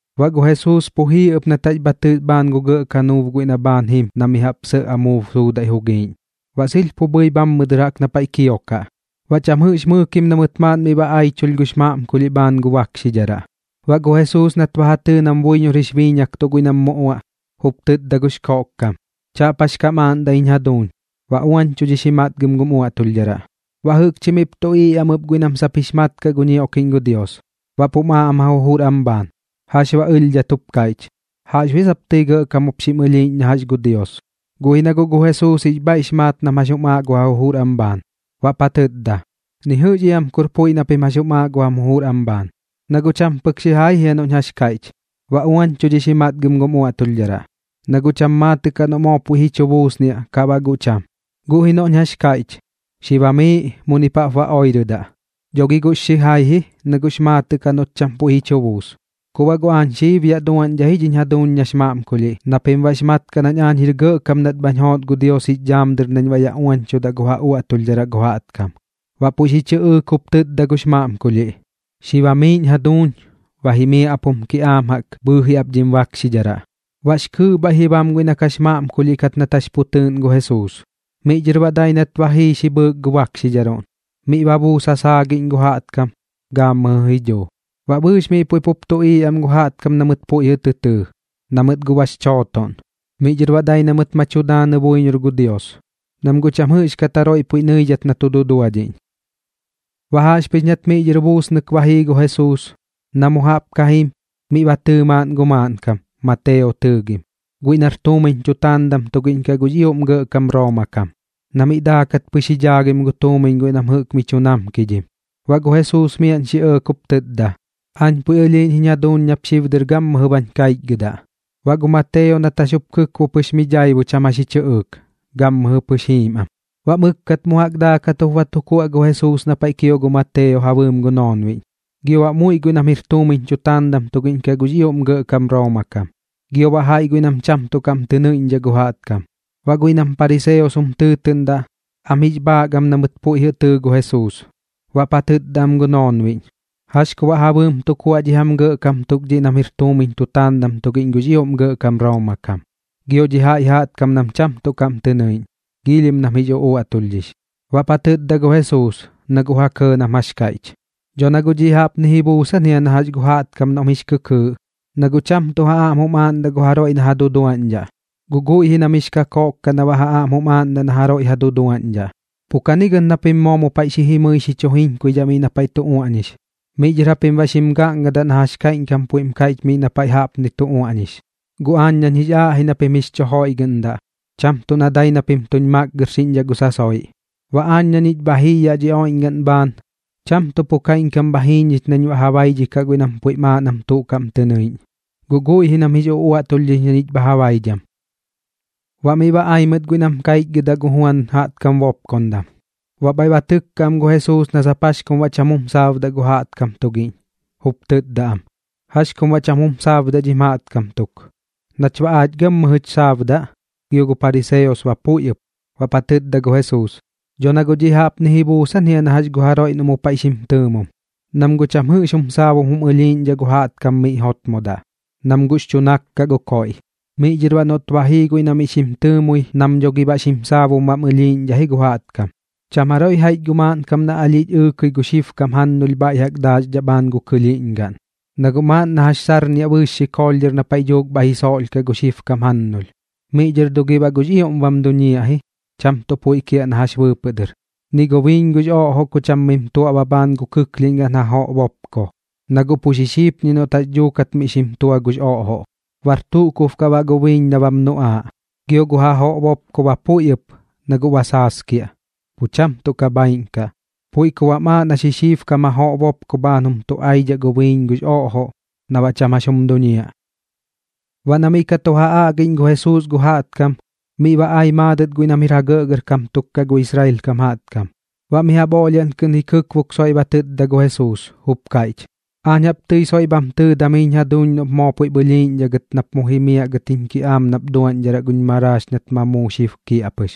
Baꞌ gu Jesuus pu jii ɨp nat jax bha tɨs bhaan gu gɇꞌ kanuub guiꞌ na pu bhaan jim na mi jaꞌp sɇꞌ amuub suudaiꞌ jugiiꞌñ, baꞌ sɨlh pu bhɨi bhammɨ dɨr jaꞌk na paiꞌ kiokaꞌ. Baꞌ cham jɨꞌx mɨɨkim na mɨt maaꞌn miꞌ ba aichulh gux maꞌmkulhiꞌ bhaan gu bakxidharaꞌ. Baꞌ gu Jesuus nat ba ja tɨɨ nam buiñor jix biiñaktuꞌ guiꞌ nam mu uaꞌ, jup tɨtda gux koꞌkkam: ―Chaꞌp jax kam aaꞌndaꞌ jiñ jaduuñ. Ba uañchudhix ji matgɨm gum uaꞌtulhdharaꞌ. Baꞌ jɨꞌkchi miꞌp tuꞌiiꞌ am ɨp guiꞌ nam sap jix mat kaꞌ gu ñioꞌkiꞌñ gu Dios, baꞌp jum aaꞌ am ja jujur am bhaan: “¿Jax baꞌ ɨlhdhat jup kaiꞌch? ¿Jaꞌxbuiꞌ aa sap tɨi gɇꞌkam jup xim ɨlhiiꞌñ na jax gu Dios?” Guꞌ ji na guꞌ gu Jesuus jix bhaiꞌx maat nam jax jum aaꞌ gu ja jujur am bhaan, baꞌp ja tɨtda: ―Ni jɨꞌx iam kur puiꞌ na pim jax jum aaꞌ gu jam jujur am bhaan. Na guꞌ cham pɨk xijai jia noꞌñ jax kaiꞌch: “Ba uañchudhix ji matgɨm gum uaꞌtulhdharaꞌ”, na guꞌ cham maatɨꞌ kaꞌ noꞌ moo puiꞌ ji chu buusniaꞌ kaꞌ baꞌ guꞌ cham. Guꞌ ji noꞌñ jax kaiꞌch: “Xi bamiiꞌ, munip jaꞌp ba oirɨdaꞌ”, dho gi guꞌx xijai ji, na guꞌx maatɨꞌ kaꞌ noꞌt cham puiꞌ ji chu buus. Ku baꞌ guꞌ aañ xib yaꞌ duaꞌñdhaꞌ ji dhiñ jaduuñ nax maꞌmkulhiꞌ na pim baꞌx mat kaꞌ nañ aañ jir gɇꞌkam nat bhañ joot gu Dios jix dhaam dɨr nañ baꞌ yaꞌ uañchudaꞌ gu ja uaꞌtulhdharaꞌ gu jaꞌtkam. Baꞌ puiꞌ xi chɨꞌɨɨk jup tɨtda gux maꞌmkulhiꞌ: ―Xi bamiiꞌñ jaduuñ. Ba jimiaꞌ ap jum kiꞌaam jaꞌk bhɨɨji ap dhim bakxidharaꞌ. Baꞌx kɨɨꞌ bhaiꞌ ji bam guiꞌ na kax maꞌmkulhiꞌ kat nat jax pu tɨɨꞌn gu Jesuus. Miꞌ dhɨr baꞌ dai nat ba jii xi bhɨɨk gu bakxidharuꞌn, miꞌ ba buus ja saagiꞌñ gu jaꞌtkam, gaammɨjɨ ji dhuu. Baꞌ bɨɨx miꞌ puiꞌ pup tuꞌiiꞌ am gu jaꞌtkam na mɨt puiꞌ jɨꞌ tɨ tɨɨ, na mɨt guꞌ bax chootoꞌn. Miꞌ dhɨr baꞌ dai na mɨt ma tu daanɨ buiñor gu Dios, nam guꞌ cham jɨꞌxkat jaroiꞌ puiꞌ nɨidhat na tu duduadhiꞌñ. Baꞌ jaꞌxpɨx nat miꞌ dhɨr buusnɨk ba jii gu Jesuus, na mu jaꞌp ka jim, miꞌ ba tɨɨ maaꞌn gu maaꞌnkam, Mateo tɨɨgim, guiꞌ nar tuumiñ tutaandam tugiꞌñ kaꞌ gux ioꞌm gɇꞌkam Rooma kam, na miꞌ daakat pɨx ji dhaagim gu tuumiñ guiꞌ nam jɨꞌk mi chu namkidhim. Baꞌ gu Jesuus miaꞌn xi ɇɇk jup tɨtda: ―Aañ puiꞌ ɨlhiiꞌñ jiñ jaduuñ nap xib dɨr gammɨjɨ bañ kaichgɨdaꞌ. Baꞌ gu Mateo nat jax jup kɨkbo pɨx miꞌp daibu cham jax ji chɨꞌɨɨk, gammɨjɨ pɨx jiim am. Baꞌ mɨkkat mu jaꞌk daakat jup ba tu kuaꞌ gu Jesuus na paiꞌ kio gu Mateo ja bɨɨm gu noonbiꞌñ, gio baꞌ muiꞌ guiꞌ nam jir tuumiñ tutaandam tugiꞌñ kaꞌ gux ioꞌm gɇꞌkam Rooma kam, gio baꞌ jaiꞌ guiꞌ nam cham tuꞌ kaꞌm tɨ nɨiꞌñdhaꞌ gu jaꞌtkam. Baꞌ guiꞌ nam pariseos jum tɨɨtɨꞌndaꞌ, am jix bhaak am na mɨt puiꞌ jɨꞌ tɨɨ gu Jesuus, baꞌp ja tɨtda am gu noonbiꞌñ: ―¿Jax ku baꞌ ja bɨɨm tu kuaꞌ dhi jam gɇꞌkam tuk dhiꞌ nam jir tuumiñ tutaandam tugiꞌñ gux ioꞌm gɇꞌkam Rooma kam, gio dhi jaiꞌ jaꞌtkam nam cham tuꞌ kaꞌm tɨ nɨiꞌñ? Giilhim nam jix uꞌuaꞌtulhdhix. Baꞌp ja tɨtda gu Jesuus, na guꞌ ja kɇɇ nam jax kaiꞌch: ―Dho na guꞌ dhiꞌ jaꞌpni ji buusan jia na jax gu jaꞌtkam noꞌm jix kɨkɨɨꞌ, na guꞌ cham tuꞌ ja aꞌm jum aaꞌndaꞌ na jaroiꞌ ja duduaꞌñdhaꞌ, guꞌ guiꞌ ji nam jix kakoꞌk kaꞌ na baꞌ ja aꞌm jum aaꞌndaꞌ na jaroiꞌ ja duduaꞌñdhaꞌ. Pu kagɨt na pim moo mu paiꞌ jimɨi xi chu jiñkuidhaꞌ miꞌ na paiꞌ tu uaꞌñix, miꞌ dhɨr japim baꞌ xim gaꞌngadaꞌ na jax kaiꞌñkam puiꞌm kaiꞌch miꞌ na paiꞌ jaꞌpni tu uaꞌñix: “Guꞌ aañ nañ jix aaꞌ ji na pim jix chu joiꞌgɨꞌndaꞌ, cham tuꞌ na dai na pim tuñ makgɨrxiꞌñdhaꞌ gu sasoiꞌ.” Baꞌ aañ na ñich bha jii yaꞌ dhi oiꞌñgaꞌn bhaan, cham tuꞌ pu kaiꞌñkam bha jii ñich nañ baꞌ ja baidhikaꞌ guiꞌ nam puiꞌm aaꞌ nam tuꞌ kaꞌm tɨ nɨiꞌñ, guꞌ guiꞌ ji nam jix uꞌuaꞌtulhdhix na ñich bha ja baidham. Baꞌ miꞌ ba ai mɨt guiꞌ nam kaichgɨdaꞌ gu Juan jaꞌtkam bopkondam, baꞌ bhaiꞌ ba tɨkka am gu Jesuus na sap jax kum baꞌ cham jum saabdaꞌ gu jaꞌtkam tugiꞌñ, jup tɨtda am: ―¿Jax kum baꞌ cham jum saabdaꞌ dhim jaꞌtkam tuk? Nach baꞌ aach gammɨjɨch xaabdaꞌ, gio gu pariseos ba puiꞌ ɨp. Baꞌp ja tɨtda gu Jesuus: ―Dho na guꞌ dhiꞌ jaꞌpni ji buusan jia na jax gu jaroiꞌ noꞌ mu paiꞌ ba xim tɨɨmom, nam guꞌ cham jɨꞌx jum saabum jum ɨlhiiꞌñdhaꞌ gu jaꞌtkam miꞌ jotmodaꞌ, nam guꞌx chu nak kaꞌ gu koiꞌ. Miꞌ dhɨr baꞌ noꞌt ba jii guiꞌ na miꞌ xim tɨɨmui nam dho gi baꞌ xim saabum bam ɨlhiiꞌñdhaꞌ ji gu jaꞌtkam. ’Cham jaroiꞌ jaiꞌch gu maaꞌnkam na alhiꞌch ɨɨkɨi gu xibkam jannulh bhaiꞌ jaꞌk daaxdhaꞌ bhaan gu kɨlhiiꞌñgaꞌn, na guꞌ maaꞌn na jax sarniaꞌ bɨɨx xikoolh dhɨr na paiꞌ dhuuk bhaiꞌ ji soꞌlhkaꞌ gu xibkam jannulh, miꞌ dhɨr dho gi baꞌ guꞌx ioꞌm bam duñiaꞌ ji, cham puiꞌ kiaꞌ na jax bɨɨpɨꞌ dɨr. Ni gu biiñ gux oꞌjoꞌ ku cham mim tuaꞌba bhaan gu kɨklhiꞌñgaꞌn jajoꞌ bopko, na guꞌ pu xi xipñiaꞌ noꞌt jax dhuukat mim tua gux oꞌjoꞌ, bar tuꞌ kub kaꞌ baꞌ gu biiñ na bam nuꞌaaꞌ, gio gu jajoꞌ bopko ba puiꞌ ɨp na guꞌ ba saaskiaꞌ, pu cham tuꞌ ka bhaiꞌn kaꞌ. Puiꞌ ku baꞌm aaꞌ na xixiibkam jajoꞌ bopko bhaan jum tuꞌaidhaꞌ gu biiñ gux oꞌjoꞌ na baꞌ cham jax jum duñiaꞌ. Baꞌ na miꞌ ka tu ja aꞌgiꞌñ gu Jesuus gu jaꞌtkam, miꞌ ba ai maadɨt guiꞌ nam jir ja gɇꞌgɇrkam tuk kaꞌ gu Israel kam jaꞌtkam. Baꞌ mi jaꞌp oꞌlhiaꞌn kɨꞌn ji kɨkbok soiꞌ ba tɨtda gu Jesuus, jup kaiꞌch: ―Aañ jaꞌp tɨi soiꞌ bham tɨɨdam jiñ jaduuñ noꞌp moo puiꞌp ɨlhiiꞌñdhaꞌ gɨt nap mu jimiaꞌ gɨt jiñ kiꞌaam nap duaꞌñdharaꞌ guñ maraax nat ma muu xib kiaꞌpɨx.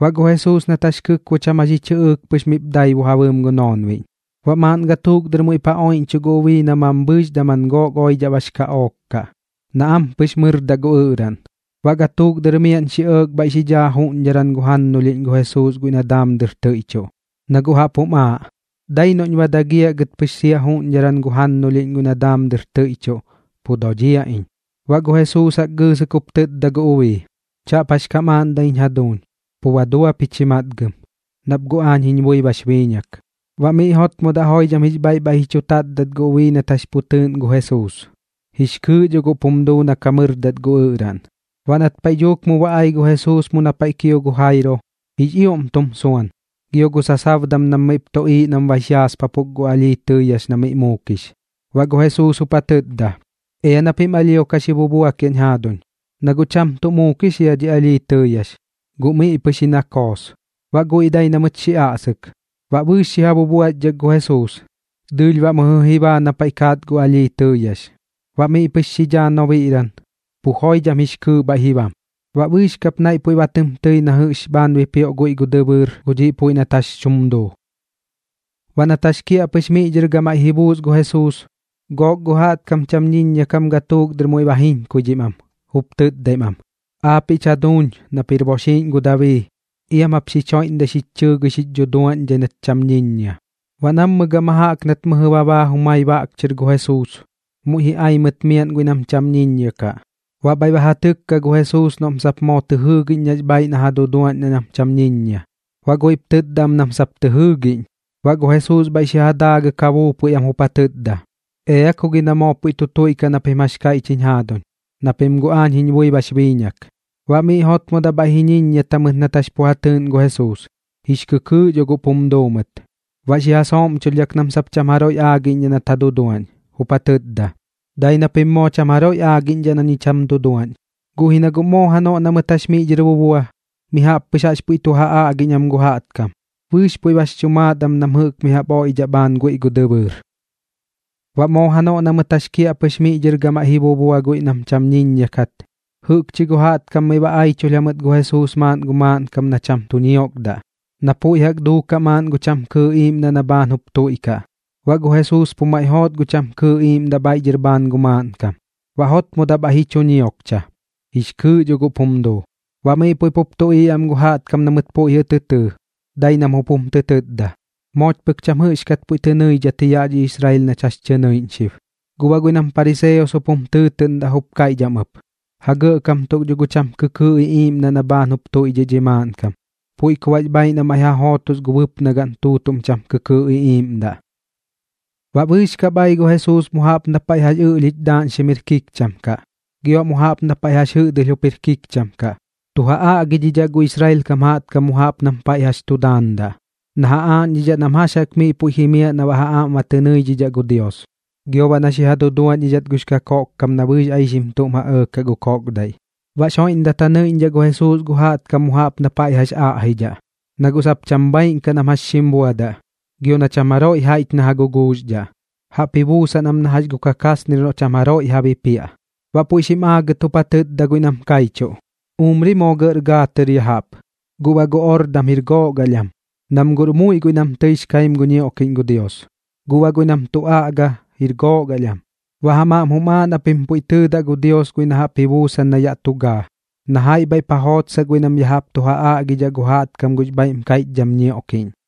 Baꞌ gu Jesuus nat jax kɨkbo cham jax ji chɨꞌɨɨk pɨx miꞌp daibu ja bɨɨm gu noonbiꞌñ. Baꞌ maaꞌn gatuuk dɨr muiꞌp ja oiꞌñchuꞌ gu ubii na mambhɨɨx daman gook oidhaꞌ bax kaꞌook kaꞌ na ampɨx mɨrdaꞌ gu ɨꞌraꞌn. Baꞌ gatuuk dɨr miaꞌn xi ɇɇk bhaiꞌ xi dhaa juꞌñdharan gu jannulhiꞌñ gu Jesuus guiꞌ na daam dɨr tɨiꞌchuꞌ, na guꞌ jaꞌp jum aaꞌ: “Dai noꞌñ ba dagiaꞌ gɨt pɨx sia juꞌñdharan gu jannulhiꞌñ guiꞌ na daam dɨr tɨiꞌchuꞌ, pu dodhiaꞌ iñ.” Baꞌ gu Jesuus jaꞌk xi gɨɨsɨk jup tɨtda gu ubii: ―Chaꞌp jax kam aaꞌndaꞌñ jaduuñ. Pu ba dua pich ji matgɨm, nap guꞌ aañ jiñ bui bax biiñak. Baꞌ miꞌ jotmodaꞌ joidham jix bhaiꞌ bhaiꞌ ji chu tatdat gu ubii nat jax pu tɨɨꞌn gu Jesuus, jix kɨɨꞌ dhop jum duu na ka mɨrdat gu ɨꞌraꞌn. Baꞌ nat paiꞌ dhuuk mu ba ai gu Jesuus mu na paiꞌ kio gu Jairo, jix ioꞌm tum suan, gio gu sasabdam nam miꞌp tuꞌiiꞌ nam bax yaaspapuk gu alhii tɨɨyax na miꞌ muukix. Baꞌ gu Jesuus jup ja tɨtda: ―Ea na pim alhio ka xi bubuakiaꞌñ jaaduñ, na guꞌ cham tuꞌ muukix jia dhi alhii tɨɨyax, guꞌ miꞌ pɨx ji na koos. Baꞌ guiꞌ dai na mɨt xi aꞌsɨk. Baꞌ bɨɨx xi ja bubuaxdhak gu Jesuus, dɨɨlh baꞌ mɨjɨ ji baa na paiꞌ kaat gu alhii tɨɨyax. Baꞌ miꞌ pɨx xi dhaa nobiꞌran, pu joidham jix kɨɨꞌ bhaiꞌ ji bam. Baꞌ bɨɨx kap naiꞌ puiꞌ ba tɨm tɨi na jɨꞌx bhaan bipioꞌ guiꞌ gu dɨbɨɨr gu dhiꞌ puiꞌ nat jax tum duu. Baꞌ nat jax kiaꞌpɨx miꞌ dhɨr gamaiꞌ ji buus gu Jesuus, gook gu jaꞌtkam cham ñiññia kam gatuuk dɨr muiꞌ ba jiñkuidhim am, jup tɨtdaim am: ―¡Aapiꞌch jaduuñ nap jir boxiiꞌñ gu Dabii, iam jap xich joiꞌmdai xich chɨɨgɨi xich dhuduaꞌñdhai nach cham ñiññia! Baꞌ nammɨ gama jaꞌk nat mɨjɨ ba baa jumai baꞌk chɨr gu Jesuus, muiꞌ ji ai mɨt miaꞌn guiꞌ nam cham ñiññia kaꞌ, baꞌ bhaiꞌ ba ja tɨkka gu Jesuus noꞌm sap moo tɨ jɨɨgiꞌñ nax bhaaiꞌ na ja duduaꞌñdhaꞌ nam cham ñiññia. Baꞌ guiꞌp tɨtda am nam sap tɨ jɨɨgiꞌñ. Baꞌ gu Jesuus bhaiꞌ xi ja daagɨk ja buupui am jup ja tɨtda: ―Ea ku gi na moo puiꞌ tu tuiꞌkaꞌ na pim jax kaiꞌch jiñ jaaduñ, na pim guꞌ aañ jiñ bui bax biiñak. Baꞌ miꞌ jotmodaꞌ bhaiꞌ ji ñiññiata mɨt nat jax pu ja tɨɨꞌn gu Jesuus, jix kɨkɨɨꞌ dho guꞌp jum duu mɨt. Baꞌ xi ja sooꞌmchulhdhak nam sap cham jaroiꞌ aagiꞌñdhaꞌ nat ja duduaꞌñ, jup ja tɨtda: ―Dai na pim moo cham jaroiꞌ aagiꞌñdhaꞌ na ñich jam duduaꞌñ. Guꞌ ji na guꞌ moo janoꞌ na mɨt jax miꞌ dhɨr bubua, mi jaꞌp pɨx jaꞌx puiꞌ tu ja aꞌgiꞌñ am gu jaꞌtkam. Bɨɨx puiꞌ bax chu maat am nam jɨꞌk mi jaꞌp oiꞌdhaꞌ bhaan guiꞌ gu dɨbɨɨr. Baꞌ moo janoꞌ na mɨt jax kiaꞌpɨx miꞌ dhɨr gamaiꞌ ji bubua guiꞌ nam cham ñiññia kat, jɨꞌkchi gu jaꞌtkam miꞌ ba aichulh jamɨt gu Jesuus maaꞌn gu maaꞌnkam na cham tu ñiokdaꞌ, na puiꞌ jaꞌk duukaꞌ maaꞌn gu cham kɨɨꞌ iiꞌmdaꞌ na bhaan jup tuiꞌkaꞌ. Baꞌ gu Jesuus pu maiꞌ joot gu cham kɨɨꞌ iiꞌmdaꞌ bhaiꞌ dhɨr bhaan gu maaꞌnkam. Baꞌ jotmodaꞌ bhaiꞌ ji chu ñiokcha, jix kɨɨꞌ dho guꞌp jum duu. Baꞌ miꞌ puiꞌ pup tuꞌiiꞌ am gu jaꞌtkam na mɨt puiꞌ jɨꞌ tɨ tɨɨ, dai nam jup jum tɨ tɨtda: ―Mooch pɨk jaꞌp cham jɨꞌxkat puiꞌ tɨ nɨidhat ji yaꞌ dhi Israel nach jax tɨ nɨiꞌñ xib. Guꞌ baꞌ guiꞌ nam pariseos jup jum tɨɨtɨꞌndaꞌ jup kaiꞌch am ɨp: ―Ja gɇꞌkam tuk dho gu cham kɨkɨɨꞌ iꞌiiꞌmdaꞌ na bhaan jup tuiꞌdhiꞌ dhi maaꞌnkam, puiꞌ ku baꞌx bhaaiꞌ na maiꞌ ja jootos gu bɨpnagaꞌn tuutuꞌm cham kɨkɨɨꞌ iꞌiiꞌmdaꞌ. Baꞌ bɨɨx kap ai gu Jesuus mu jaꞌp na paiꞌ jax ɨꞌlhich daaꞌñxim jir kikcham kaꞌ, gio baꞌ mu jaꞌp na paiꞌ jax jɨꞌdɨlh jup jir kikcham kaꞌ, tu ja aꞌgidhidhaꞌ gu Israel kam jaꞌtkam mu jaꞌp nam paiꞌ jax tu daandaꞌ, na ja aaꞌñdhidhaꞌ nam jax jaꞌk miꞌ puiꞌ jimiaꞌ na baꞌ ja aꞌm ba tɨ nɨidhidhaꞌ gu Dios, gio baꞌ na xi ja duduaꞌñdhidhat gux kakoꞌkkam na bɨɨx aixim tuꞌm ja ɇɇkaꞌ gu koꞌkdaiꞌ. Baꞌx joiꞌmdat ja nɨidhidhaꞌ gu Jesuus gu jaꞌtkam mu jaꞌp na paiꞌ jax aꞌjidhaꞌ, na guꞌ sap cham bhaaiꞌn kaꞌ nam jax xim buadaꞌ, gio na cham jaroiꞌ jaiꞌch na ja guguuxdhaꞌ. Jaꞌp ji buusan am na jax gu kakasnir noꞌ cham jaroiꞌ ja bipiaꞌ. Baꞌ puiꞌ xim aagɨt jup ja tɨtda guiꞌ nam kaichuꞌ: ―Umri moo gɇꞌr gaa tɨr ya jaꞌp, guꞌ baꞌ gu ordam jir gook alh am. Nam guꞌr muiꞌ guiꞌ nam tɨix kaim gu ñioꞌkiꞌñ gu Dios, guꞌ baꞌ guiꞌ nam tu aꞌga, jir gook alh am. Baꞌ jam aꞌm jum aaꞌ na pim pu tɨɨdaꞌ gu Dios guiꞌ na jaꞌp ji buusan na yaꞌ tu gaa, na jaiꞌ bhaiꞌp ja jootsaꞌ guiꞌ nam ya jaꞌp tu ja aꞌgidhaꞌ gu jaꞌtkam gux bhaiꞌm kaiꞌchdham ñioꞌkiꞌñ.